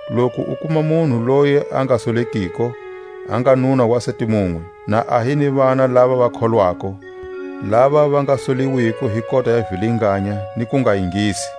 loku u kuma munhu loyi a nga solekiko, a nga nuna wa sati munwe, na a hi ni vana lava va kholwako, lava va nga soliwiko hi kota ya vilinganya ni kungaingisi.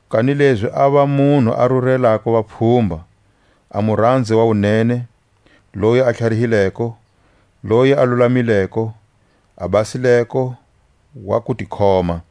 kanilezi a va munhu a rurelako vapfhumba, a muranzi wa wunene, loyi a tlharihileko, loyi a lulamileko, a basileko, wa kutikhoma;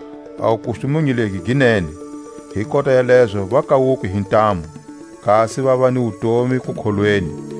A wukustumunyu legi gi nene. Hi kota ya lezo va kawuke hi ntamu, kasi vava ni wutomi kukholweni,